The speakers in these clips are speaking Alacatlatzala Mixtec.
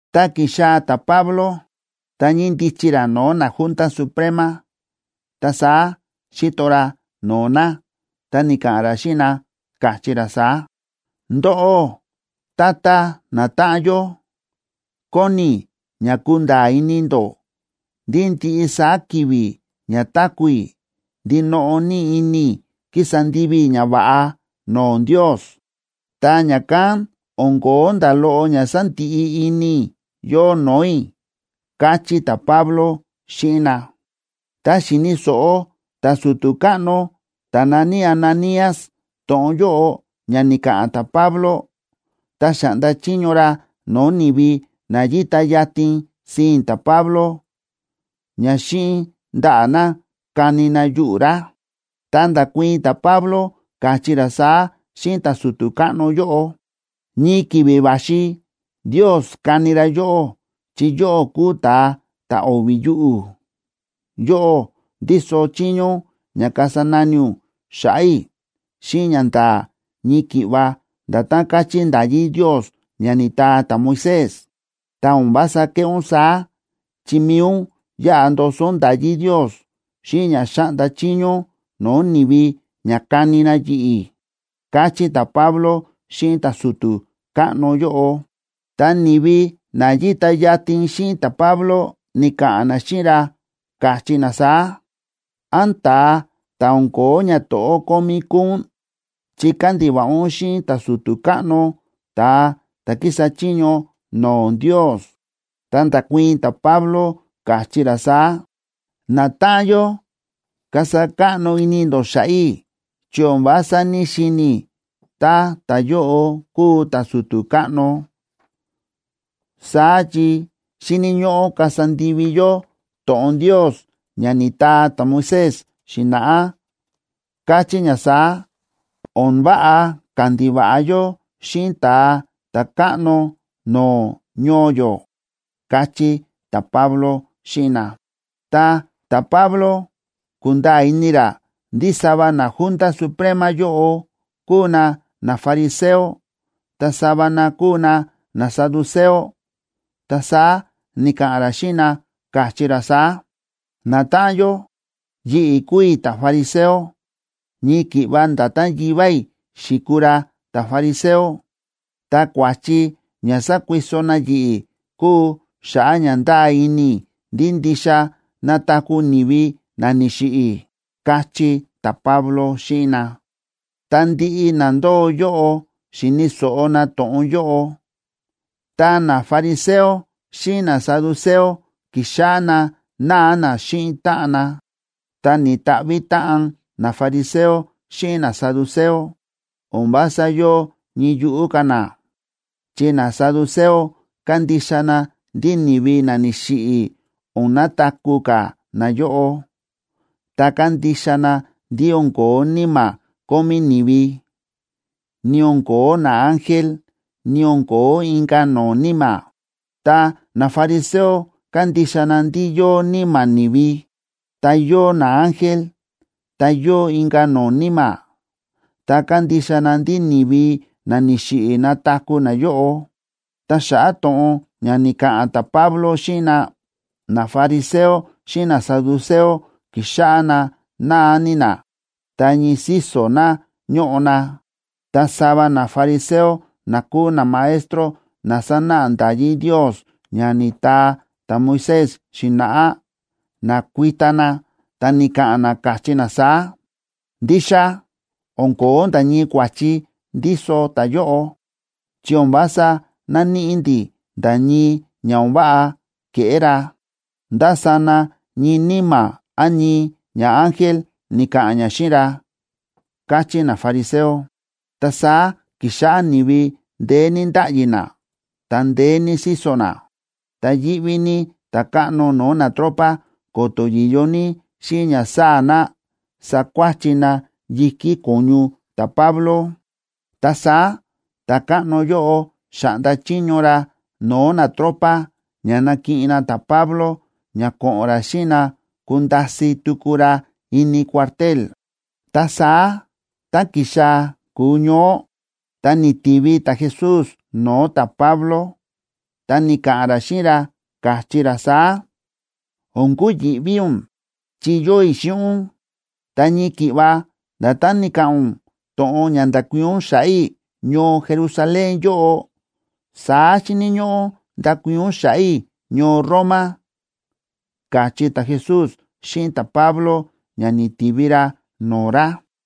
Tá ki̱xaa̱ ta̱Pablo, ta ñíndichi ra no̱o̱ naJunta Suprema, ta saá xíto ra no̱o̱ na ta ni̱ka̱ꞌa̱n ra xíꞌin na, káchí ra saá: ―Ndóꞌó, tata natáꞌan yó, kóni i̱ ña kunda̱a̱ ini ndó ndí ndiꞌi saá ki̱vi̱ ña táku̱ i̱ ndinoꞌo ní ini i̱ ki̱sa ndivi i̱ ñava̱ꞌa no̱o̱ Ndios, ta ña̱kán o̱n ko̱ó nda̱ loꞌo ña sándiꞌi ini i̱ yóo no̱o̱ i̱ ―káchí ta̱Pablo xíꞌin na. Tá xi̱ni̱ so̱ꞌo ta̱su̱tu̱ káꞌno ta̱ na̱ní Ananías to̱ꞌon yóꞌo ña ni̱ka̱ꞌa̱n ta̱Pablo, ta xa̱ꞌnda chiño ra no̱o̱ ni̱vi na yíta yatin sii̱n ta̱Pablo ña xíꞌin ndaꞌa̱ na kani na yuꞌu̱ ra. Ta nda̱kuii̱n ta̱Pablo, káchí ra saá xíꞌin ta̱su̱tu̱ káꞌno yóꞌo: ―Ñii ki̱vi̱ va̱xi Ndios kani ra yóꞌó chi yóꞌó kúu ta̱a ta̱ o̱vi̱ yuꞌu̱. Yóꞌó ndíso chiño ún ña kasa nani ún xa̱ꞌa̱ i̱ xíꞌin ñanda̱a̱ ñii ki̱ꞌva nda̱tán káchí nda̱yí Ndios ña ni̱taa ta̱Moisés. Ta o̱n vása kéꞌé ún saá, chi mi̱i ún yáꞌa ndoso ún nda̱yí Ndios, xíꞌin ña xa̱ꞌnda chiño ún no̱o̱ ni̱vi ña kani na yi̱ꞌi̱ ―káchí ta̱Pablo xíꞌin ta̱su̱tu̱ káꞌno yóꞌo. Ta ni̱vi na yíta yatin xíꞌin ta̱Pablo, ni̱ka̱ꞌa̱n na xíꞌin ra, káchí na saá: ―¿Án ta̱a ta̱ o̱n ko̱ó ñato̱ꞌó kómí kúu ún?, chi kándiva̱ꞌa ún xíꞌin ta̱su̱tu̱ káꞌno, ta̱a ta̱ kísa chiño no̱o̱ Ndios. Ta nda̱kuii̱n ta̱Pablo, káchí ra saá: ―Natáꞌan yó, kasa káꞌno ini ndó xa̱ꞌa̱ i̱ chi o̱n vása ní‑xini̱ i̱ tá ta̱yóꞌo kúu ta̱su̱tu̱ káꞌno, saá chi xíni̱ ñóꞌó kasa ndivi yó to̱ꞌon Ndios ña ni̱taa ta̱Moisés xi̱na̱ꞌá, káchí ña saá: “O̱n váꞌa kandiva̱ꞌa yó xíꞌin ta̱a ta̱káꞌno no̱o̱ ñoo yó”, ―káchí ta̱Pablo xíꞌin na. Ta ta̱Pablo ku̱nda̱a̱ ini ra ndí sava naJunta Suprema yóꞌo kúu na nafariseo, ta sava na kúu na nasaduceo, ta saá ni̱ka̱ꞌa̱n ra xíꞌin na, káchí ra saá: ―Natáꞌan yó, yi̱ꞌi̱ kúu i̱ ta̱fariseo, ñii ki̱ꞌva nda̱tán yivá i̱ xi̱kuu ra ta̱fariseo. Ta kua̱chi ña sákuiso na yi̱ꞌi̱ kúu xa̱ꞌa̱ ña ndáa ini i̱ ndí ndixa nataku̱ ni̱vi na ni̱xiꞌi̱ ―káchí ta̱Pablo xíꞌin na. Tá ndiꞌi na ndóo yóꞌo xi̱ni̱ so̱ꞌo na to̱ꞌon yóꞌo, ta nafariseo xíꞌin nasaduceo ki̱xáꞌá na náa na xíꞌin táꞌan na, ta ni̱ta̱ꞌvi̱ táꞌan nafariseo xíꞌin nasaduceo. O̱n vása yóo ñii yuꞌú ka̱ na, chi nasaduceo kándixa na ndí ni̱vi na ni̱xiꞌi̱ o̱n nataku̱ ka̱ nayóꞌo, ta kándixa na ndí o̱n ko̱ó níma̱ kómí ni̱vi, ni o̱n ko̱ó naángel, ni o̱n ko̱ó inka̱ no̱o̱ níma̱. Ta nafariseo kándixa na ndí yóo níma̱ ni̱vi, ta yóo naángel, ta yóo inka̱ no̱o̱ níma̱, ta kándixa na ndí ni̱vi na ni̱xiꞌi̱ nataku̱ nayóꞌo. Ta xa̱ꞌa̱ to̱ꞌon ña ni̱ka̱ꞌa̱n ta̱Pablo xíꞌin na, nafariseo xíꞌin nasaduceo, ki̱xáꞌá na náa ní na, ta ñii síso̱ na ñóꞌo na. Ta sava nafariseo na kúu namaestro na sánáꞌa nda̱yí Ndios ña ni̱taa ta̱Moisés xi̱na̱ꞌá, na̱kuita na ta ni̱ka̱ꞌa̱n na, káchí na saá: ―Ndixa o̱n ko̱ó nda̱ ñii kua̱chi ndíso ta̱yóꞌo, chi o̱n vása náníꞌi ndi̱ nda̱ ñii ña o̱n váꞌa ke̱ꞌé ra. Ndá sana ñii níma̱ án ñii ñaángel ni̱ka̱ꞌa̱n ña xíꞌin ra ―káchí nafariseo. Ta saá ki̱xáꞌá ni̱vi ndeé ní ndáꞌyi na, ta ndeé ní síso̱ na. Ta yíꞌví ní ta̱káꞌno no̱o̱ natropa ko̱to̱ yi̱yo ní xíꞌin ña sáa̱ na, sakuáchi na yi̱kí ko̱ñu ta̱Pablo. Ta saá ta̱káꞌno yóꞌo xa̱ꞌnda chiño ra no̱o̱ natropa ña nakiꞌin na ta̱Pablo ña ko̱ꞌo̱n ra xíꞌin na kunda̱si̱ tuku ra ini cuartel. Ta saá tá ki̱xaa̱ ku̱ñoó, ta ni̱tivi ta̱Jesús no̱o̱ ta̱Pablo, ta ni̱ka̱ꞌa̱n ra xíꞌin ra, káchí ra saá: ―O̱n kuyi̱ꞌví ún, chi yóo i̱ xíꞌin ún. Ta ñii ki̱ꞌva nda̱tán ni̱ka̱ꞌa̱n ún to̱ꞌon ña nda̱kuii̱n ún xa̱ꞌa̱ i̱ ñoo Jerusalén yóꞌo, saá xíni̱ ñóꞌó ndakuii̱n ún xa̱ꞌa̱ i̱ ñoo Roma ―káchí ta̱Jesús xíꞌin ta̱Pablo, ña ni̱tivi ra no̱o̱ ra.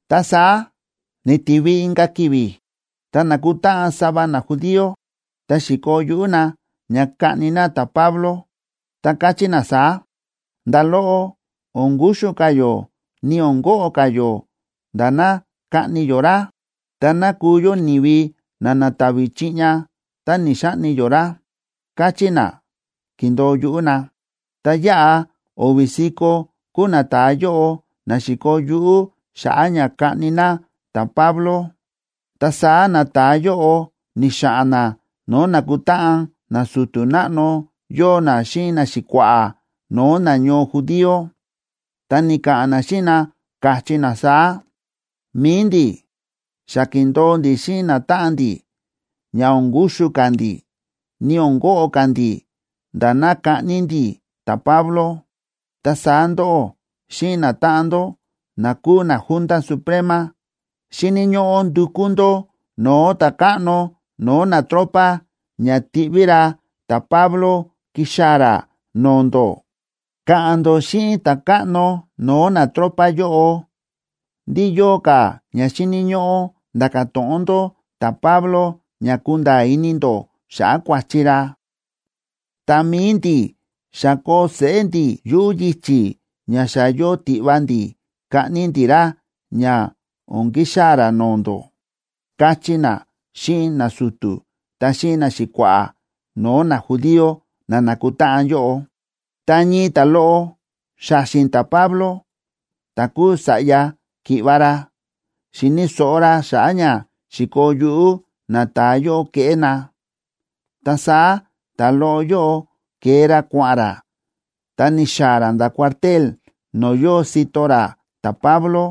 Ta saá ni̱tivi inka̱ ki̱vi̱, ta na̱kutáꞌan sava najudío, ta xi̱koo yuꞌú na ña kaꞌni na ta̱Pablo, ta káchí na saá: ―Nda̱ loꞌo o̱n kuxu ka̱ yó ni o̱n koꞌo ka̱ yó nda̱ ná kaꞌni yó ra. Ta ná kuu yó ni̱vi na na̱ta̱vi̱ chiꞌña tá ni̱‑xaꞌni yó ra ―káchí na, ki̱ndo̱o yuꞌú na. Ta yáꞌa o̱vi̱ si̱ko̱ kúu nata̱a yóꞌo na xi̱koo yuꞌú xa̱ꞌa̱ ña kaꞌni na ta̱Pablo. Ta saá nata̱a yóꞌo ni̱xa̱ꞌa̱n na no̱o̱ nákutáꞌan nasu̱tu̱ náꞌno yóo na xíꞌin naxi̱kua̱ꞌa̱ no̱o̱ nañoo judío, ta ni̱ka̱ꞌa̱n na xíꞌin na, káchí na saá: ―Mi̱i ndi̱ xa ki̱ndo̱o ndi̱ xíꞌin natáꞌan ndi̱ ña o̱n kuxu ka̱ ndi̱, ni o̱n koꞌo ka̱ ndi̱ nda̱ ná kaꞌni ndi̱ ta̱Pablo. Ta saá ndóꞌó xíꞌin natáꞌan ndó na kúu naJunta Suprema, xíni̱ ñóꞌó ndukú ndó no̱o̱ ta̱káꞌno no̱o̱ natropa ña tiꞌví ra ta̱Pablo kixaa̱ ra no̱o̱ ndó. Ka̱ꞌa̱n ndó xíꞌin ta̱káꞌno no̱o̱ natropa yóꞌo ndí yóo ka̱ ña xíni̱ ñóꞌó nda̱ka̱ to̱ꞌon ndó ta̱Pablo ña kunda̱a̱ ini ndó xa̱ꞌa̱ kua̱chi ra. Ta mi̱i ndi̱, xa koo seꞌé ndi̱ yuꞌu̱ yichi̱, ña xa yóo tiꞌva ndi̱ kaꞌni ndi̱ ra ña o̱n kixaa̱ ra no̱o̱ ndó ―káchí na xíꞌin nasu̱tu̱ ta xíꞌin naxi̱kua̱ꞌa̱ no̱o̱ najudío na nákutáꞌan yóꞌo. Ta ñii ta̱loꞌo xa̱xi̱n ta̱Pablo ta̱ kúu sa̱ꞌya ki̱ꞌva̱ ra, xi̱ni̱ so̱ꞌo ra xa̱ꞌa̱ ña xi̱koo yuꞌú nata̱a yóꞌo keꞌé na, ta saá ta̱loꞌo yóꞌo ke̱e ra kua̱ꞌa̱n ra, ta ni̱xaa̱ ra nda̱ cuartel no̱o̱ yóo sito ra ta̱Pablo,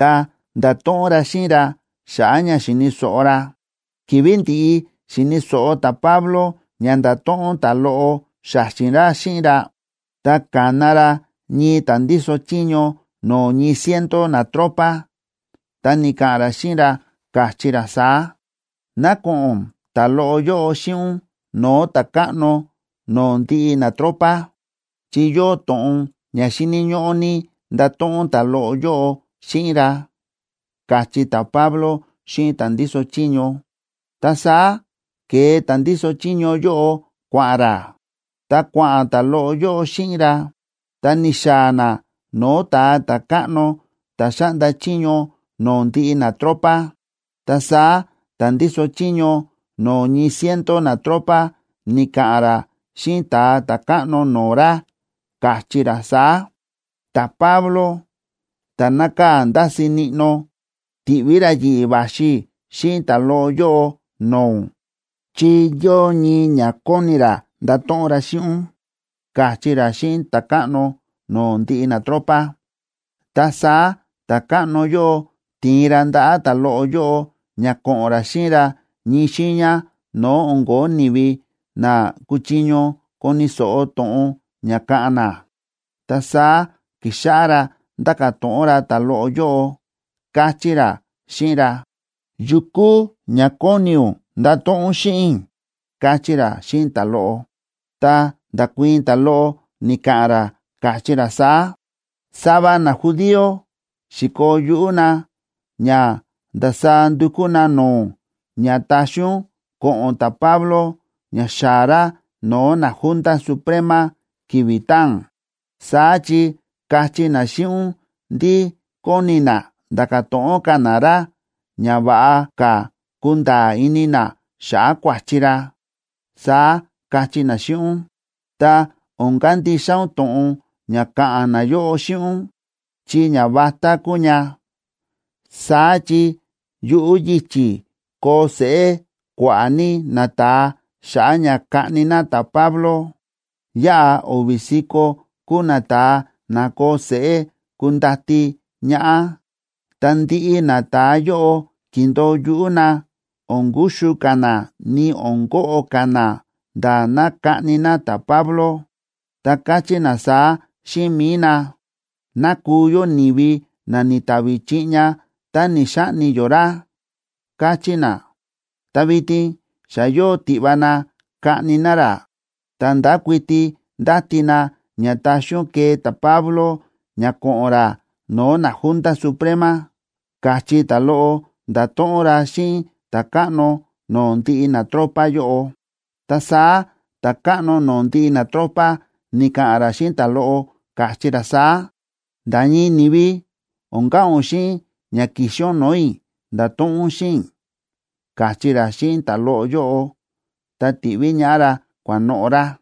ta nda̱to̱ꞌon ra xíꞌin ra xa̱ꞌa̱ ña xi̱ni̱ so̱ꞌo ra. Ki̱vi̱ ndi̱ꞌi xi̱ni̱ so̱ꞌo ta̱Pablo ña nda̱to̱ꞌon ta̱loꞌo xa̱xi̱n ra xíꞌin ra, ta ka̱na ra ñii ta̱ ndíso chiño no̱o̱ ñii ciento natropa, ta ni̱ka̱ꞌa̱n ra xíꞌin ra, káchí ra saá: ―Ná ko̱ꞌo̱n ta̱loꞌo yóꞌo xíꞌin ún no̱o̱ ta̱káꞌno no̱o̱ ndiꞌi natropa, chi yóo to̱ꞌon ña xíni̱ ñóꞌó ní ndato̱ꞌon ta̱loꞌo yóꞌo xíꞌin ra ―káchí ta̱Pablo xíꞌin ta̱ ndíso chiño. Ta saá ke̱e ta̱ ndíso chiño yóꞌo kua̱ꞌa̱n ra, ta kua̱ꞌa̱n ta̱loꞌo yóꞌo xíꞌin ra, ta ni̱xaa̱ na no̱o̱ ta̱a ta̱káꞌno ta̱ xáꞌnda chiño no̱o̱ ndiꞌi natropa. Ta saá ta̱ ndíso chiño no̱o̱ ñii ciento natropa ni̱ka̱ꞌa̱n ra xíꞌin ta̱a ta̱káꞌno no̱o̱ ra, káchí ra saá: ―Ta̱Pablo ta̱ nákaa̱ ndási níꞌnó, ti̱ꞌví ra yi̱ꞌi̱ va̱xi i̱ xíꞌin ta̱loꞌo yóꞌo no̱o̱ ún, chi yóo ñii ña kóni ra ndato̱ꞌon ra xíꞌin ún ―káchí ra xíꞌin ta̱káꞌno no̱o̱ ndiꞌi natropa. Ta saá ta̱káꞌno yóꞌo ti̱in ra ndaꞌa̱ ta̱loꞌo yóꞌo ña ko̱ꞌo̱n ra xíꞌin ra ñii xiiña no̱o̱ o̱n ko̱ó ni̱vi na kuchiño koni̱ so̱ꞌo to̱ꞌon ña káꞌa̱n na. Ta saá ki̱xáꞌá ra ndáka̱ to̱ꞌon ra ta̱loꞌo yóꞌo, káchí ra xíꞌin ra: ―¿Ndá to̱ꞌon kúu ña kóni ún ndato̱ꞌon ún xíꞌin i̱? ―káchí ra xíꞌin ta̱loꞌo. Ta nda̱kuii̱n ta̱loꞌo, ni̱ka̱ꞌa̱n ra, káchí ra saá: ―Sava najudío xi̱koo yuꞌú na ña ndasaá ndukú na no̱o̱ ún ña taxi ún ko̱ꞌo̱n ta̱Pablo ña xaa̱ ra no̱o̱ naJunta Suprema ki̱vi̱ taa̱n. Saá chi kachí na xíꞌin ún ndí kóni na nda̱ka̱ to̱ꞌon ka̱ na ra ña va̱ꞌa ka̱ kunda̱a̱ ini na xa̱ꞌa̱ kua̱chi ra, saá kachí na xíꞌin ún. Ta o̱n kandixa ún to̱ꞌon ña ka̱ꞌa̱n nayóꞌo xíꞌin ún, chi ñavatá kuu ña. Saá chi yuꞌu̱ yichi̱ koo seꞌé kua̱ꞌa̱ ní nata̱a xa̱ꞌa̱ ña kaꞌni na ta̱Pablo. Yáꞌa o̱vi̱ si̱ko̱ kúu nata̱a na koo seꞌé kundati ñaꞌá, ta ndiꞌi nata̱a yóꞌo ki̱ndo̱o yuꞌú na o̱n kuxu ka̱ na ni o̱n koꞌo ka̱ na nda̱ ná kaꞌni na ta̱Pablo. Ta káchí na saá xíꞌin mi̱i na: “Ná kuu yó ni̱vi na ni̱ta̱vi̱ chiꞌña tá ni̱‑xaꞌni yó ra”, káchí na. Ta vitin xa yóo tiꞌva na kaꞌni na ra, ta ndákuiti ndáti na ña taxi ún kee ta̱Pablo ña ko̱ꞌo̱n ra no̱o̱ naJunta Suprema ―káchí ta̱loꞌo nda̱to̱ꞌon ra xíꞌin ta̱káꞌno no̱o̱ ndiꞌi natropa yóꞌo. Ta saá ta̱káꞌno no̱o̱ ndiꞌi natropa ni̱ka̱ꞌa̱n ra xíꞌin ta̱loꞌo, káchí ra saá: ―Nda̱ ñii ni̱vi o̱n ka̱ꞌa̱n ún xíꞌin ña ki̱xi ún no̱o̱ i̱ nda̱to̱ꞌon ún xíꞌin i̱ ―káchí ra xíꞌin ta̱loꞌo yóꞌo, ta ti̱ꞌví ñaꞌá ra kua̱noꞌo̱ ra.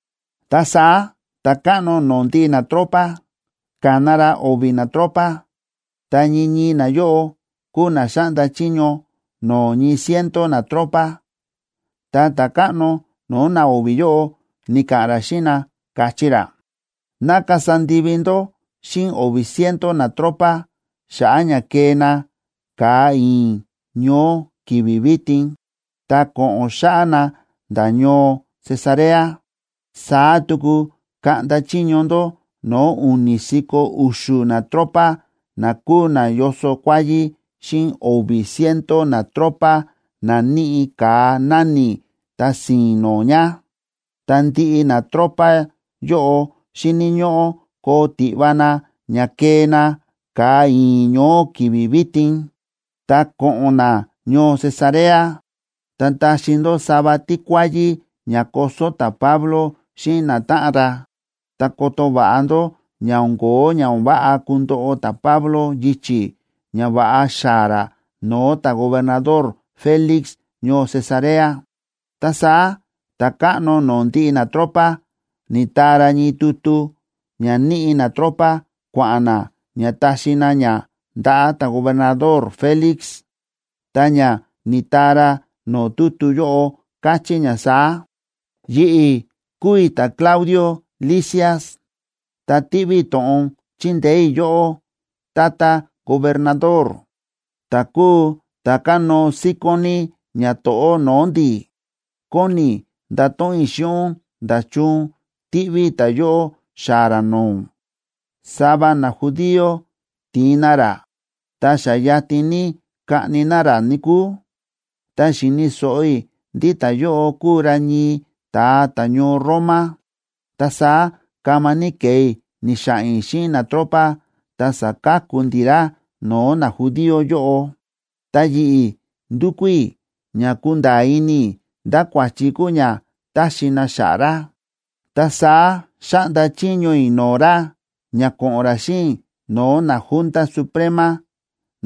Ta saá ta̱káꞌno no̱o̱ ndiꞌi natropa ka̱na ra o̱vi̱ natropa, ta ñii ñii nayóꞌo kúu na xáꞌnda chiño no̱o̱ ñii ciento natropa, ta ta̱káꞌno no̱o̱ na o̱vi̱ yóꞌo ni̱ka̱ꞌa̱n ra xíꞌin na, káchí ra: ―Ná kasa ndivi ndó xíꞌin o̱vi̱ ciento natropa xa̱ꞌa̱ ña kee na ka̱a i̱i̱n ñoó ki̱vi̱ vitin,a ta ko̱ꞌo̱n xáꞌá na nda̱ ñoo Cesarea. Saá tuku kaꞌnda chiño ndó no̱o̱ u̱ni̱ si̱ko̱ u̱xu̱ natropa na kúu na yóso kuáyí xíꞌin o̱vi̱ ciento natropa na níꞌi ka̱a náni̱ ta si̱i̱n no̱o̱ ña, ta ndiꞌi natropa yóꞌo xíni̱ ñóꞌó koo tiꞌva na ña kee na ka̱a i̱i̱n ñoó ki̱vi̱ vitin, ta ko̱ꞌo̱n na ñoo Cesarea. Ta taxi ndó sava tíkuáyí ña koso ta̱Pablo xíꞌin natáꞌan ra, ta koto va̱ꞌa ndó ña o̱n kóo ña o̱n váꞌa kundoꞌo ta̱Pablo yichi̱ ña va̱ꞌa xaa̱ ra no̱o̱ ta̱gobernador Félix ñoo Cesarea. Ta saá ta̱káꞌno no̱o̱ ndiꞌi natropa ni̱taa ra ñii tutu ña níꞌi natropa kua̱ꞌa̱n na ña taxi na ña ndaꞌa̱ ta̱gobernador Félix. Ta ña ni̱taa ra no̱o̱ tutu yóꞌo káchí ña saá: “Yi̱ꞌi̱ kúu i̱ ta̱Claudio Lisias, ta tíꞌví i̱ to̱ꞌon chindeé i̱ yóꞌó, tata gobernador, ta̱ kúu ta̱ kánóo síkón ní ñato̱ꞌó no̱o̱ ndi̱. Kóni i̱ ndato̱ꞌon i̱ xíꞌin ún nda̱chun tíꞌví i̱ ta̱yóꞌo xaa̱ ra no̱o̱ ún. Sava najudío ti̱in na ra, ta xa yatin ní kaꞌni na ra, níkúu. Ta xi̱ni̱ so̱ꞌo i̱ ndí ta̱yóꞌo kúu ra ñii ta̱a ta̱ñoo Roma, ta saá kama ní ke̱e i̱ ni̱xa̱ꞌa̱n i̱ xíꞌin natropa, ta sa̱ka̱ku ndi̱ ra no̱o̱ najudío yóꞌo. Ta yi̱ꞌi̱ ndu̱kú i̱ ña kunda̱a̱ ini i̱ ndá kua̱chi kúu ña táxi na xa̱ꞌa̱ ra, ta saá xa̱ꞌnda chiño i̱ no̱o̱ ra ña ko̱ꞌo̱n ra xíꞌin i̱ no̱o̱ naJunta Suprema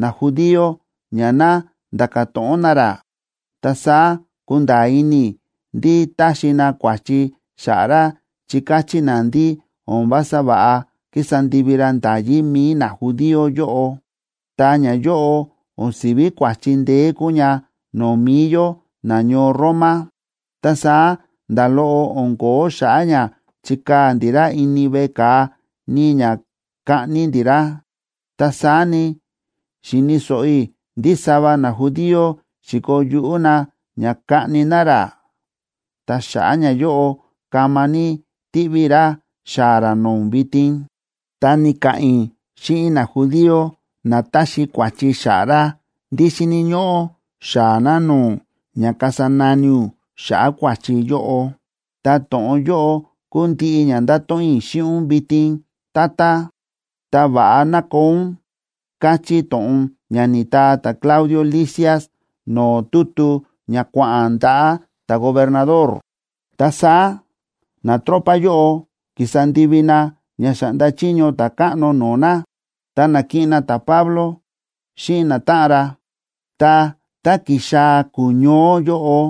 najudío ña ná nda̱ka̱ to̱ꞌon na ra. Ta saá ku̱nda̱a̱ ini i̱ ndí táxi na kua̱chi xa̱ꞌa̱ ra chi káchí na ndí o̱n vása va̱ꞌa kísa ndivi ra nda̱yí mi̱i najudío yóꞌo, ta ñayóꞌo o̱n si̱ví kua̱chi ndeé kúu ña no̱o̱ mi̱i yó nañoo Roma. Ta saá nda̱ loꞌo o̱n ko̱ó xa̱ꞌa̱ ña chikaa̱ ndi̱ ra ini veꞌe ka̱a ni ña kaꞌni ndi̱ ra. Ta saá ni, xi̱ni̱ so̱ꞌo i̱ ndí sava najudío xi̱koo yuꞌú na ña kaꞌni na ra, ta xa̱ꞌa̱ ñayóꞌo kama ní tíꞌví i̱ ra xaa̱ ra no̱o̱ ún vitin. Ta ni̱ka̱ꞌa̱n i̱ xíꞌin najudío na táxi kua̱chi xa̱ꞌa̱ ra ndí xíni̱ ñóꞌó xaa̱ na no̱o̱ ún ña kasa nani ún xa̱ꞌa̱ kua̱chi yóꞌo. Ta to̱ꞌon yóꞌo kúu ndiꞌi ña ndáto̱ꞌon i̱ xíꞌin ún vitin, tata. Ta va̱ꞌa ná koo ún”, káchí to̱ꞌon ña ni̱taa ta̱Claudio Lisias no̱o̱ tutu ña kua̱ꞌa̱n ndaꞌa̱ ta̱gobernador. Ta saá natropa yóꞌo ki̱sa ndivi na ña xa̱ꞌnda chiño ta̱káꞌno no̱o̱ na, ta na̱kiꞌin na ta̱Pablo xíꞌin natáꞌan ra. Ta tá ki̱xaa̱ ku̱ñoó yóꞌo,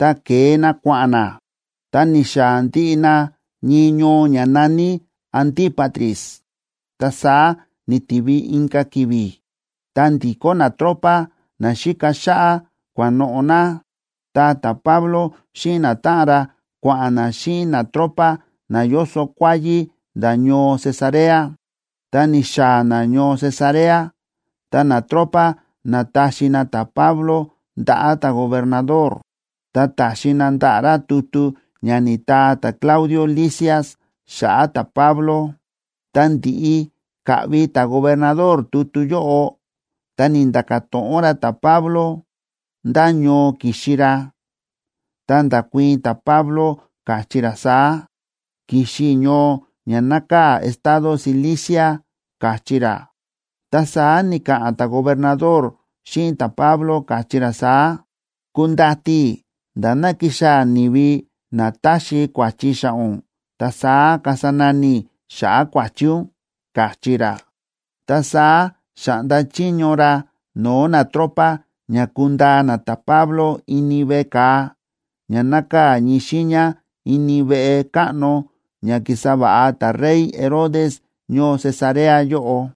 ta ke̱e na kua̱ꞌa̱n na, ta ni̱xaa̱ ndiꞌi na ñii ñoo ña na̱ní Antípatris. Ta saá ni̱tivi inka̱ ki̱vi̱, ta ndi̱kó natropa na xíka xáꞌá, kua̱noꞌo̱ na. Ta ta̱Pablo xíꞌin natáꞌan ra kua̱ꞌa̱n na xíꞌin natropa na yóso kuáyí nda̱ ñoo Cesarea. Tá ni̱xaa̱ na ñoo Cesarea, ta natropa na̱taxi na ta̱Pablo ndaꞌa̱ ta̱gobernador, ta ta̱xi na ndaꞌa̱ ra tutu ña ni̱taa ta̱Claudio Lisias xa̱ꞌa̱ ta̱Pablo. Ta ndi̱ꞌi ka̱ꞌvi ta̱gobernador tutu yóꞌo, ta ni̱nda̱ka̱ to̱ꞌon ra ta̱Pablo ndá ñoo ki̱xi ra. Ta nda̱kuii̱n ta̱Pablo, káchí ra saá: ―Ki̱xi i̱ ñoo ña nákaa̱ estado Cilicia ―káchí ra. Ta saá ni̱ka̱ꞌa̱n ta̱gobernador xíꞌin ta̱Pablo, káchí ra saá: ―Kundati i̱ nda̱ ná kixaa̱ ni̱vi na táxi kua̱chi xa̱ꞌa̱ ún, ta saá kasa nani i̱ xa̱ꞌa̱ kua̱chi ún ―káchí ra. Ta saá xa̱ꞌnda chiño ra no̱o̱ natropa ña kundaa na ta̱Pablo ini veꞌe ka̱a ña nákaa̱ ñii xiiña ini veꞌe káꞌno ña ki̱sa va̱ꞌa ta̱rey Herodes ñoo Cesarea yóꞌo.